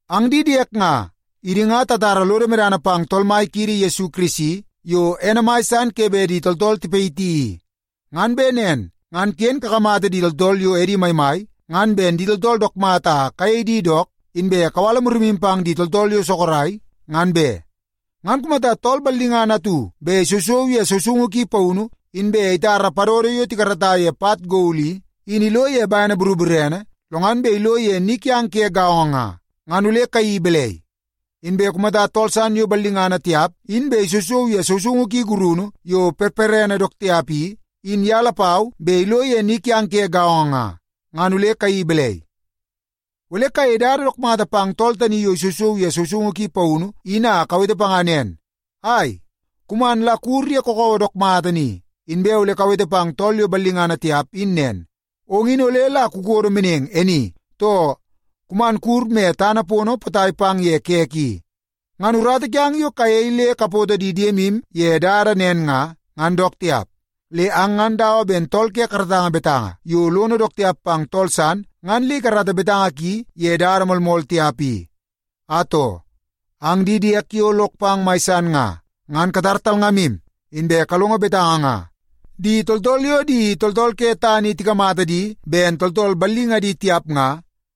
Ang di diek nga, idi nga tatara lodo medana pang Tool Mai kiidi Yesu Kirisi yo ene mai san ke bet di tooltool tipayiti i. Ngan bet nen ngan ken kakamata di tooltool yo edi maimai, ngan ben di tooltool dook mata a kayei di dook, inbe kawala murimu pang di tooltool yo sorok, ngan be. Ngan kumata tool ballingana atu bet isousou ye sousoungu ki paunu, inbe itara padodo yo tikarata ye pat gol i, in ilo ye bene boroborene, lo ngan bet ilo ye ni kiang ke gaongo nga, ngan ole kayeii balai? Inbe kumata tool san yo ballingana tiap in bet isousou ye sousoungu ki gurunu yo perperene dook tiap i, in ye lapau bet ilo ye ni kiang ke gaongo nga, ngan ole kayeii balai? Ole kayei dada dook mata pang tool tani yo isousou ye sousoungu ki paunu in a kawete panga nen, “Ai, kuman la kuwur ye kakawa dook mata ni.” Inbe ole kawete pang tool yo ballingana tiap in nen, “Ong in ole la kukodo meneng e ni,” too “Kuman kuwur me tana pono potai pang ye kek i.” Ngan urata kiang yo kayei le kapoto di diemu ye dada nen nga, ngan dook tiap. Le ang ngan dawa ben tool ke karatanga betanga yo lono dook tiap pang tool san ngan le ikarata betanga ki ye dada moolmool tiap i. Atoo, ang di diek yo lok pang mai san nga, ngan katar talngamu, inbe kalongo betanga nga. Di tooltool yo di tooltool ke tana i tikamata di ben tooltool ballingadi tiap nga,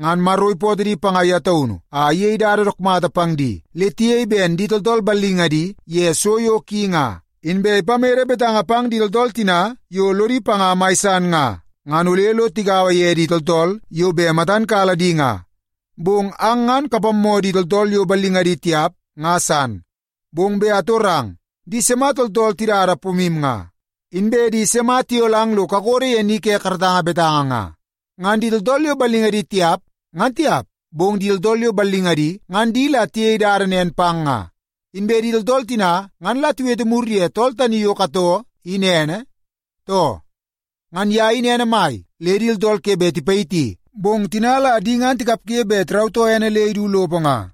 ngan Maro ipootoo di panga ye taunu a iyei dada dook mata pang di le tiyei ben di tooltool ballingadi ye so yo ki nga. Inbe ipamede betanga pang di tooltool tina yo lodi panga mai san nga, ngan ole lo tigaua ye di tooltool yo bet matan kala di nga. Bong ang ngan kapammoo di tooltool yo ballingadi tiap nga san. Bong bet atorang, di sima tooltool tidada pomu nga? Inbe di sima tiyolang lo kakodo ye ni ke karatanga betanga nga? Ngan di tooltool yo ballingadi tiap, ngan tiap, bong di tooltool yo ballingadi ngan di la tiyei dada nen pang nga. Inbe di tooltool tina ngan la tiwete mur ye tool tani yo katoo in ene, too? Ngan ye in ene mai le di tooltool ke bet tiyitmaki, bong tina la di ngan tikapge bet tirautoo ene le idu lopo nga.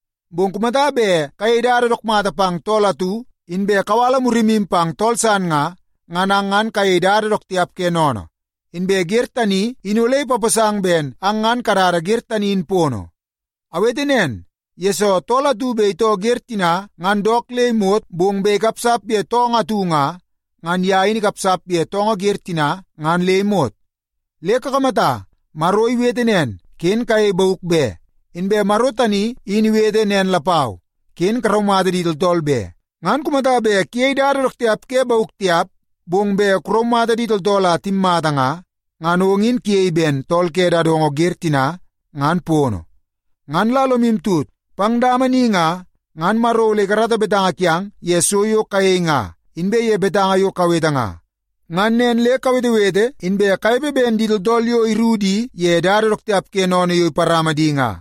Bong kumata bet kayei dada dook mata pang tool atu, inbe kawala murimu pang tool san nga, ngan ang ngan kayei dada dook tiap ke sennene. Inbe wer tani in ole ipaposang ben ang ngan kadada wer tani in pono. Awete nen, yesoo tool atu bet itoo wer tina ngan dook le imot, bong bet ikapsap ye toongoo atu nga, ngan ye in ikapsap ye toongoo wer tina ngan le imot. Le kakamata, Maro iwete nen, “Ken kuyei bauk be.” Inbe Maro tani in iwete nen lapau, “Ken kuraumata di tooltool be.” Ngan kumata bet kuyei dada dook tiap ke bauk tiap, bong bet kuraumata di tooltool a timmata nga, ngan ong in kuyei ben tool ke dadongo wer tina ngan pono. Ngan la lomu tut, pang dama ni nga, ngan Maro ole ikarata betanga kiang ye so yo kayei nga, inbe ye betanga yo kawete nga. Ngan nen le kawetewete inbe kanepe ben di tooltool yo iruku di ye dada dook tiap ke sennene yo iparama di nga.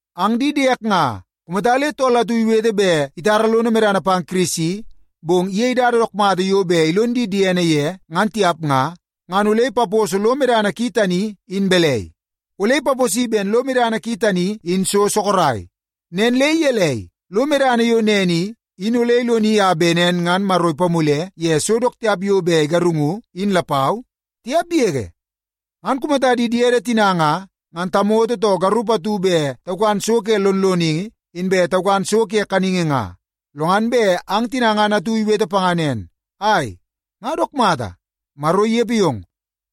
Ang di diek nga, kumata le tool atu iwete bet itara lono medana pang Kirisi, bong iyei dada dook mata yo bet ilon di diene ye ngan tiap nga, ngan ole ipaposo lo medana ki tani in balai? Ole ipaposi ben lo medana ki tani in so sorok. Nen le gelei, lo medana yo nen i, in ole iloni a bet nen ngan Maro ipamule ye so dook tiap yo bet igarungu in lapau? Tiap yege! Ngan kumata di diede tina nga, ngan tamoto too garup atu bet taukan so ke lonloningi, inbe taukan so ke kaningi nga, lo ngan bet ang tina ngan atu iwete panga nen, “Ai, nga dook mata, Maro inepe yong.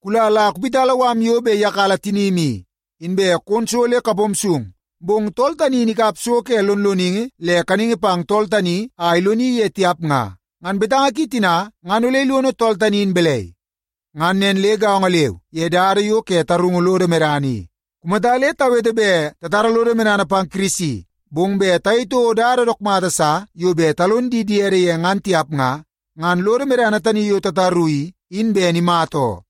Kula la kuwiti mala yo bet iyakala tinim i, inbe kon so le kapom sung,” bong tool tani in ikap so ke lonloningi le kaningi pang tool tani a iloni ye tiap nga, ngan betanga ki tina ngan ole ilono tool tani in balai? Ngan nen le gaongo leu ye dada yo ke tarungu lodo medana i. Kumata le tawete bet tatara lodo medana pang Kirisi, bong bet tayei toko dada dook mata sa yo bet talon di diede ye ngan tiap nga, ngan lodo medana tani yo tataru i, in ben imata oo.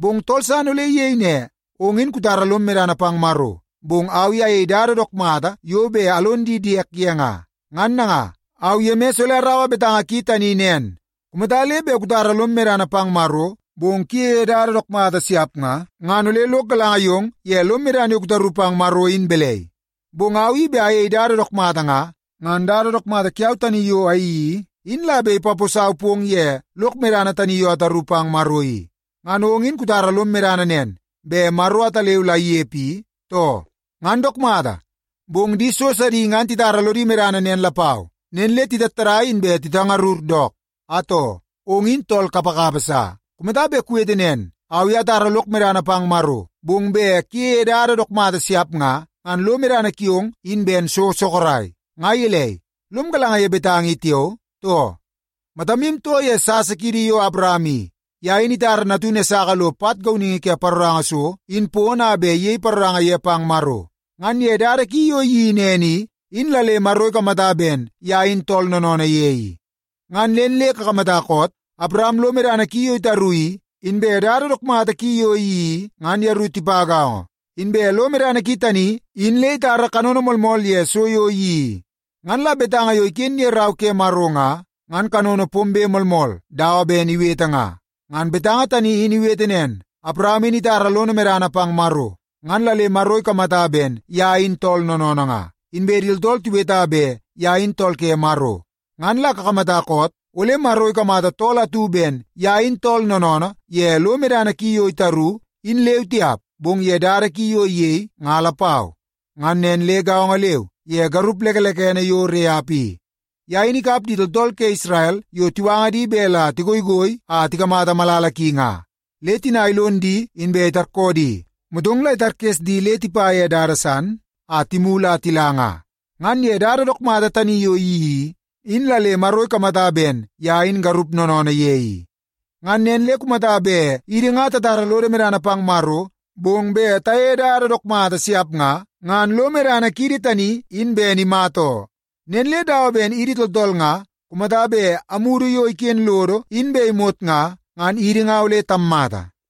Bong tool san ole iyei ne, “Ong in kutara lom medana pang Maro, bong au i ayei dada dook mata yo bet alon di diek ye nga.” Ngan nanga, au Yemis ole araua betanga ki tani nen. Kumata le bet kutara lom medana pang Maro, bong kuyeie dada dook mata siap nga, ngan ole lok galanga yong ye lom medana yo kutaru pang Maro in balai? Bong au i bet ayei dada dook mata nga, ngan dada dook mata kiau tani yo ayeii i, in la bet ipaposau pong ye lok medana tani yo ataru pang Maro i. Ngan ong in kutara lom medana nen, bet Maro ataleu la inepe i, too? Ngan dook mata! Bong di so sidi ngan titara lodi medana nen lapau, nen le titattadai inbe titangarur dook. Atoo, ong in tool kapakapa sa! Kumata bet kuwete nen, “Au i atara lok medana pang Maro,” bong bet kuyeie dada dook mata siap nga, ngan lo medana kiong in ben so sorok. Nga gelei, lom galanga ye betanga i tiao, too? Matamu too ye sasa kiidi yo Awaram i. Ye in itara natunu Esaka lo pat gauningi ke paroranga so in pono a bet iyei paroranga ye pang Maro. Ngan ye dada ki yo iyeii nen i, in la le Maro ikamata ben ye in tool noonoonoo ye i. Ngan nen le kakamata koot? Awaram lo medana ki yo itaru i, inbe dada dook mata ki yo iyeii i, ngan yeru tipa gaongo. Inbe lo medana ki tani in le itara kanono moolmool ye so yo iyeii i. Ngan la betanga yo iken ye Rau ke Maro nga, ngan kanono pombe moolmool dawa ben iwete nga. Ngan betanga tani in iwete nen, “Awaram in itara lono medana pang Maro, ngan la le Maro ikamata ben ye in tool noonoonoo nga.” Inbe di tooltool tiweta bet ye in tool ke Maro. Ngan la kakamata koot? Ole Maro ikamata tool atu ben ye in tool noonoonoo ye lo medana ki yo itaru, in leu tiap, bong ye dada ki yo iyei nga lapau. Ngan nen le gaongo leu ye garup lekelekene yo Reap i. Ye in ikap di tooltool ke Isrel yo tiwanga di bet la tigoigoi a tikamata malala ki nga. Le tina ilon di inbe itarkoo di, motong la itarkes di le tipa ye dada san, a timulu a tila nga. Ngan ye dada dook mata tani yo iyeii i, in la le Maro ikamata ben ye in garup noonoonoo ye i. Ngan nen le kumata bet idi nga tatara lodo medana pang Maro, bong bet tayeie dada dook mata siap nga, ngan lo medana kiidi tani in ben imata oo. Nen le dawa ben idi tooltool nga, kumata bet amudu yo iken lodo in bet imot nga, ngan idi nga ole tammata.